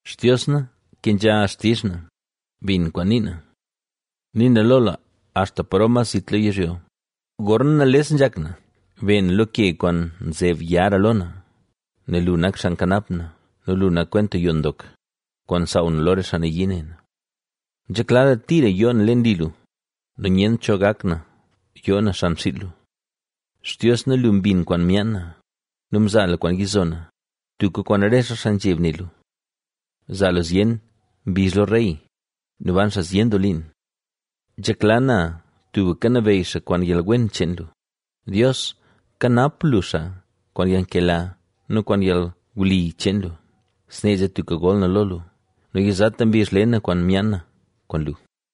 Xtios na, kenzha xtizh na; bin kwaan nii na. Nii na lo lu, axta paro mas zit lo yizhyo, gorna nales nzhak na. Be na lo ke kwaan nzeb yara lo na. Nel lu nak xaa nkanap na nu lu nak kwenta yoo ndok, kwaan nsaaw na lo re xaa nayii ne na. Nzhekla na tira yoo na leen li lu nu nyent cho gak na yoo na xan xiil lu. Xtios na, lu mbin kwaan myaan na nu mzaa lu kwaan yizo na, tubka kwaan rese xaa nzheb ne lu. Zaa lu zyen mbizh lo rey nu ban xaa zyen doo liin. Nzhekla na tubka nabeyy xaa kwaan yalwen cheen lu; Dios, kanap lu xaa kwaan yalnkela nu kwaan yalwli cheen lu. Snee zee tubka gol na lo lu nu yizata mbizh le na kwaan myaan na kwaan lu.